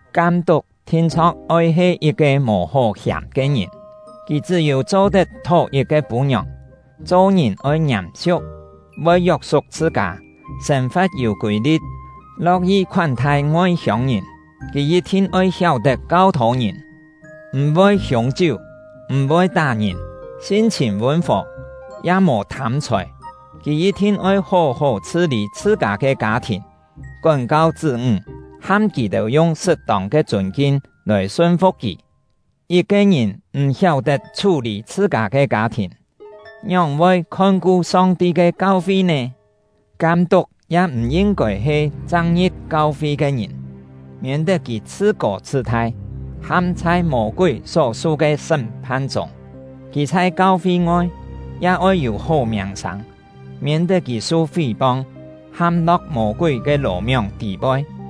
Kam-tuk thin-chho̍k oi he yit-ke mò hó hiàm ke ngìn. Kì chṳ́-yû cho-tet thó yit-ke pû-ngiòng “thó yit-ke pû-ngiòng” ya-he yi̍t-cho “kiet-fûn yit-pái”.; cho-ngìn oi ngiàm-siu̍k, voi yok-suk chhṳ-kâ, sên-fa̍t yû kûi-li̍t, lo̍k-yi khoán-thai ngoi-hiông-ngìn. Kì yit-thin oi hiáu-tet kau-thô ngìn; m̀-voi hiûng-chiú, m̀-voi tá-ngìn, sin-chhìn vûn-fò, ya mò thâm-chhòi. Kì yit-thin oi hó-hó chhṳ-lî chhṳ-kâ ke kâ-thìn, kón-kau chṳ́-ńg, ham kì-têu yung sṳt-tông ke chûn-kin lòi sun-fu̍k kì. Yit-ke ngìn m̀ hiáu-tet chhú-lî chhṳ-kâ ke kâ-thìn, ngióng-voi khon-ku Song-ti ke kau-fi nè? Kam-tuk ya m̀ yin-kôi he chang ngi̍p kau-fi ke ngìn, miên-tet kì chhṳ-kô chhṳ-thai, ham chhai Mô-kúi só-su ke sṳ́m-phan chûng. Kì chhai kau-fi-ngoi ya oi yû hó miàng-sâng, miên-tet kì su fí-pong, ham-lo̍k Mô-kúi ke lò-mióng tî-poi.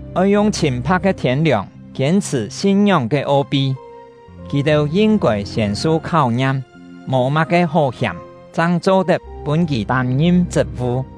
oi yung chhîn-pha̍k ke thiên-liòng kiên-chhṳ̀ sin-ngióng ke o-pi. Kì-têu yin-kôi siên su kháu-ngiam, mò má-ke hó hiàm chang cho-tet pûn kì tâm-ngim chṳt-vu.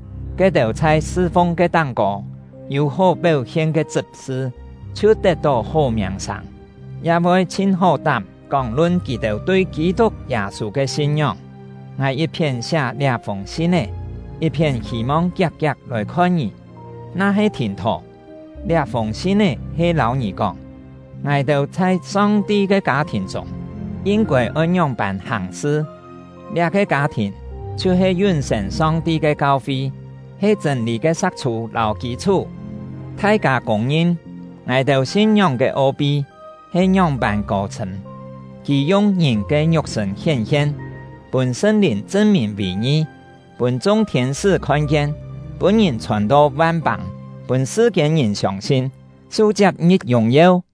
Ke-têu chhai sṳ-fung ke táng-kô yû hó péu-hien ke chṳp-sṳ chhiu tet-tó hó miàng-sâng, ya voi chhin hó-tám kóng-lun kì-têu tui Kî-tuk Yâ-sû ke sin-ngióng. Ngài yit-phién siá liá-fûng sin-é, yit-phién hî-mong kiak-kiak lòi-khon ngì; na-he thìn-thò, liá-fûng sin-é he lâu ngì kóng, ngài-têu chhai Song-ti ke kâ-thìn chûng yin-kôi oi ngióng-pân hàng-sṳ. Liá-ke kâ-thìn chhiu-he yún-sên Song-ti ke kau-fi, he chṳ̂n-lî ke sa̍k-chhû lâu kî-chhú. Thai-kâ kûng-ngin, ngài-têu sin-ngióng ke o-pi he ngióng-pân kô-chhṳ̂m: Kì yung ngìn ke ngiuk-sṳ̂n hién-hien, pûn Sṳn-Lìn chṳn-mìn vì ngi, pûn chung thiên-sṳ́ khon-kien, pûn ngìn chhòn to van-pâng, pûn sṳ-kiên-ngìn siông-sin, su-chiap ngi̍p yùng-yeu.